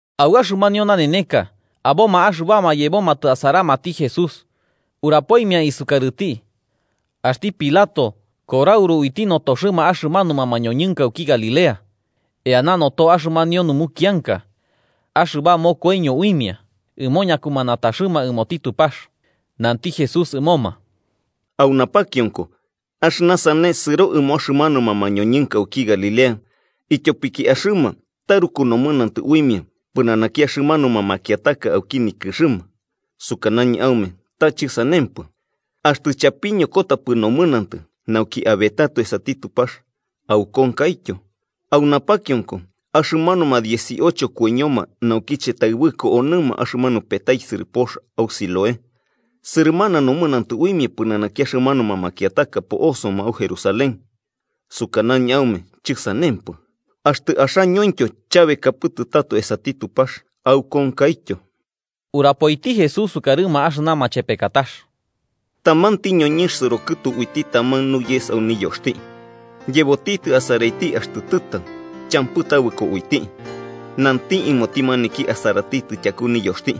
Au axɨmanio naneneka aboma axɨbama yebomatɨ asaramati Jesús, urapoimia isukarɨti axti Pilato korauru uiti notoxɨma axɨmanuma mañoñɨnka auki Galilea eana noto axɨmanio numukianka axɨba mokoiño uimia ɨmo ñakumanataxɨma ɨmoti Tupax. Nanti Jesús ɨmoma: “¿Au napakionko axɨna sane sɨro ɨmo axɨmanuma mañoñɨnka auki Galilea ityopiki axɨma taruku nomɨnantɨ uimia pɨnanaki axɨmanuma makiataka auki nikɨxɨma? Sukanañɨ aume ta chɨsanempɨ. Axtɨ chapiñokotapɨ nomɨnantɨ nauki abetato esati Tupax, aukonkaityo. ¿Au napakionko axɨmanuma dieciocho koiñoma naukiche taɨbɨko onɨma axɨmanu petaisɨrɨ pox au Siloé sɨrɨmana nomɨnantɨ uimia pɨnanaki axɨmanuma makiataka po'osoma au Jerusalén? Sukanañɨ aume chɨsanempɨ. Axtɨ axañointyo chabekapɨtɨ tato esati Tupax, aukonkaityo.” Urapoiti Jesús sukarɨma axɨna machepekatax: “Tamanti ñoñɨnx sɨro kɨtu uiti taman nuyes au niyoxti, yebotitɨ asaraiti axtɨ tɨtau, champɨ tabɨko uiti. Nanti ɨmoti maniki asaratitɨ tyaku niyoxti: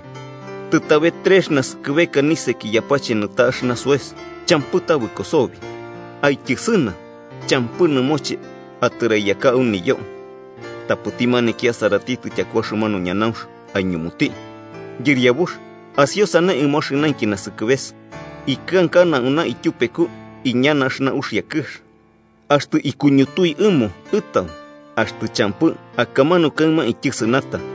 ‘Tɨtabe, trex naskɨbeka niseki yapache nɨta axɨna soes, champɨ tabɨko sobi. Aityɨsɨna. ¿Champɨ ɨmoche atɨraiyaka au niyo?’ Tapɨti maniki asaratitɨ tyaku axɨmanu ñanaunx aiñumuti: ‘Yɨriabux, asiosane ɨmo axɨnainki nasɨkɨbeka. Ikɨnkana auna ityupeku iñana axɨna uxia kɨx. Axtɨ kuñutui ɨmo ɨtau. Axtɨ champɨ, akamanu kaɨma aityɨsɨnata.’”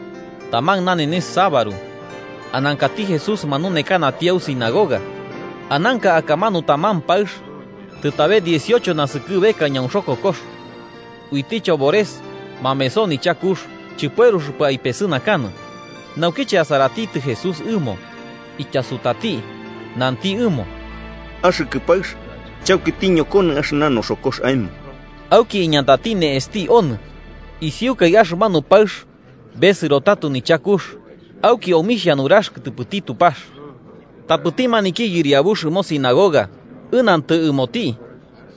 Taman nanenes sabaru anankati Jesús manunekanati au sinagoga. Ananka akamanu taman paɨx tɨtabe dieciocho naskɨbeka ñaunxokokox. Uiti chobores mameso nichakux, chɨpueruxɨpɨ aipesɨnakanɨ. Naukiche asaratitɨ Jesús ɨmo, ityasutati nanti ɨmo: –Axɨkɨ paɨx, chauki tiñokonɨ axɨna noxokox aemo. Auki iñatati ne'exti onɨ, isiukai axɨmanu paɨx besɨro tato nichakux auki omixhia nurax kɨtɨpɨti Tupax. Tapɨti maniki yɨriabux ɨmo sinagoga ɨnantɨ ɨmoti,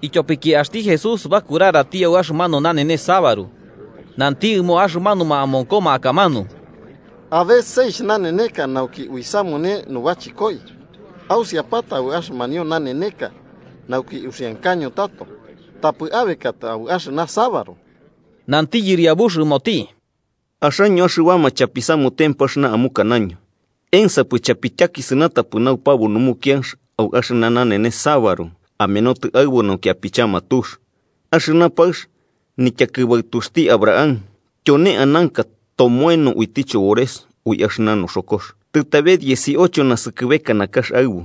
ityopiki axti Jesús bakurarati au axɨmanu nanenes sabaru, nanti ɨmo axɨmanuma amonkoma akamanu: –Abe seixh naneneka nauki uisamune nubachɨkoi. Ausiapata au axɨmanio naneneka nauki uxiankaño tato, tapɨ abekatɨ au axɨna sabaru. Nanti Yɨriabux ɨmoti: –Axaño axɨbama chapisamutempɨ axɨna amukanaño, ¿ensapɨ chapityakisɨnatapɨ naupabu numukianx au axɨna nanenes sabaru, amenotɨ aɨbu nauki apichama tux? Axɨna paɨx, nityakɨbaɨtuxti Abraham tyone ananka tomoeno uiti chobores ui axɨna noxokox tɨtabe dieciocho naskɨbeka nakax aɨbu,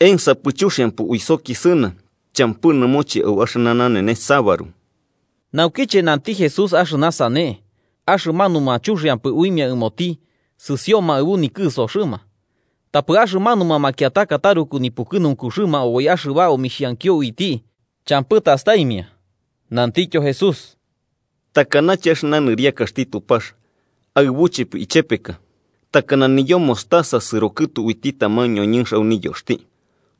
¿ensapɨ chuxiampɨ uisokisɨna champɨ nɨmoche au axɨna nanenes sabaru? Naukiche nanti Jesús axɨna sane, axɨmanuma chuxiampɨ uimia ɨmoti sɨsioma aɨbu nikɨsoxɨma. Tapɨ axɨmanuma makiataka taruku nipukɨnunkuxɨma oboi axɨba omixhankio uiti champɨ tastaimia. Nantityo Jesús: “¿Takanache axɨna nɨriakaxti Tupax aɨbuchepɨ ichepeka? Takana niyo mostaza sɨrokɨtu uiti taman ñoñɨnx au niyoxti,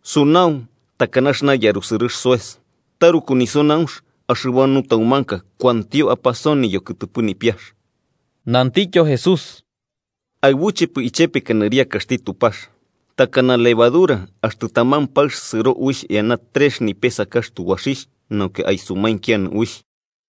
sunau takana axɨna yarusɨrɨx soes, taruku nisunaunx axɨba nutaumanka kuantio apasoni yokɨtɨpɨ nipiax.” Nantityo Jesús: “¿Aɨbuchepɨ ichepeka nɨriakaxti Tupax? Takana levadura axtɨ taman paɨx sɨro uixh eana trex nipesakax tubaxixh nauki aisumainkianɨ uixh.”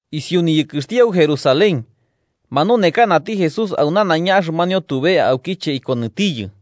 Isiu niyɨkɨxti au Jerusalén, manunekanati Jesús au nanaiña axɨmanio tube aukiche ikonɨtiyɨ.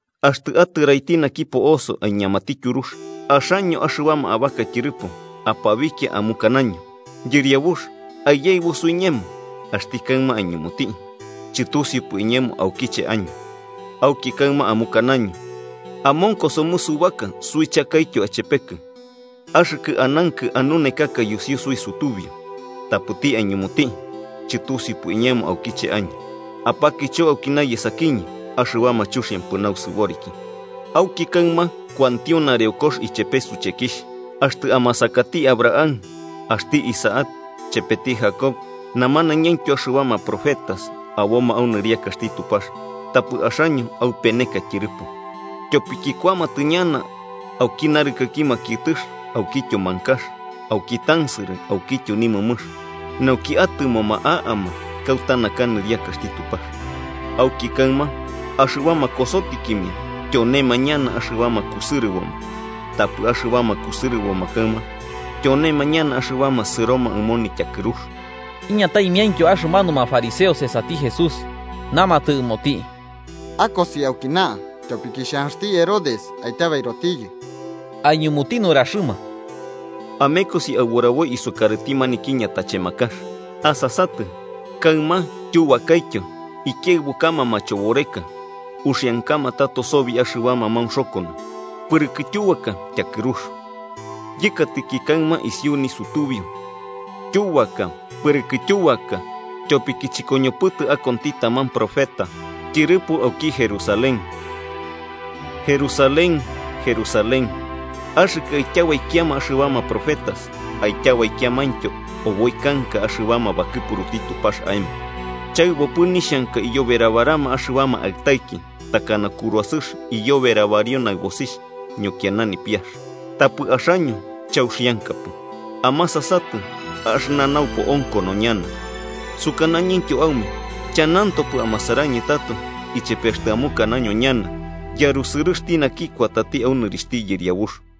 Axtɨ atɨraiti naki po'oso aiñamati tyurux, axaño, axɨbama abaka tyɨrɨpo, apabikia amukanaño: ‘Yɨriabux, aiyaɨbu suiñemo.’ Axti kaɨma aiñumuti: ‘Chɨtusiupɨ iñemo aukiche año.’ Auki kaɨma amukanaño: ‘Amonko somɨ subaka suichakaityo achepekɨ, axɨkɨ anankɨ anunekaka yusiu suisutubiu.’ Tapɨti aiñumuti: ‘Chɨtusiupɨ iñemo aukiche año. ¡Apakicho aukina yesakiñɨ, axɨbama chuxiampɨ nausɨboriki!’ Auki kaɨma kuantio nareokox ichepe suchekixh, axtɨ amasakati Abraham, axti Isaac, chepeti Jacob namanañaintyo axɨbama profetas aboma au nɨriakaxti Tupax, tapɨ axaño aupeneka tyɨrɨpo. Tyopiki kuamatɨ ñana auki narɨkɨki makiɨtɨx aukityo mankax, auki tansɨrɨ aukityo nimɨmɨx, nauki atɨmoma a'ama kauta naka nɨriakaxti Tupax. Auki kaɨma axɨbama kosotikimia tyonema ñana axɨbama kusɨrɨboma, tapɨ axɨbama kusɨrɨboma kaɨma tyonema ñana axɨbama sɨroma ɨmo nityakɨrux. Iñataimiaintyo axɨmanuma fariseos esati Jesús, namatɨ ɨmoti: –Akosi aukina, ityopiki xhanxti Herodes aityabairotiyɨ. Aiñumuti nuraxɨma: –Amekosi aburaboi isukarɨti maniki ñatachemakax: ‘Asasatɨ, kaɨma tyubakaityo ikiaɨbukama machoboreka uxiankama tato sobi axɨbama maunxokono, pɨrɨkɨ tyubaka tyakɨrux.’ Yɨkatɨki kaɨma isiu nisutubiu, tyubaka pɨrɨkɨ tyubaka, tyopiki chɨkoñopɨtɨ akonti taman profeta tyɨrɨpo auki Jerusalén. “¡Jerusalén, Jerusalén, axɨkɨ aityabaikiama axɨbama profetas aityabaikiamaintyo oboi kanka axɨbama bakɨpuruti Tupax aemo! ¡Chaɨbopɨ nixhanka iyoberabarama axɨbama aɨtaiki, takana kuruasɨx iyoberabario naɨbosixh ñokiana nipiax, tapɨ axaño chauxiankapɨ! Amasatɨ, axɨna naupo onkono ñana. Sukanañɨntyo aume chanantopɨ amasarañɨ tato ichepe axtɨ amukanaño ñana: ‘¡Yarusɨrɨxti naki kuatɨ au nɨrixhti Yɨriabux!’”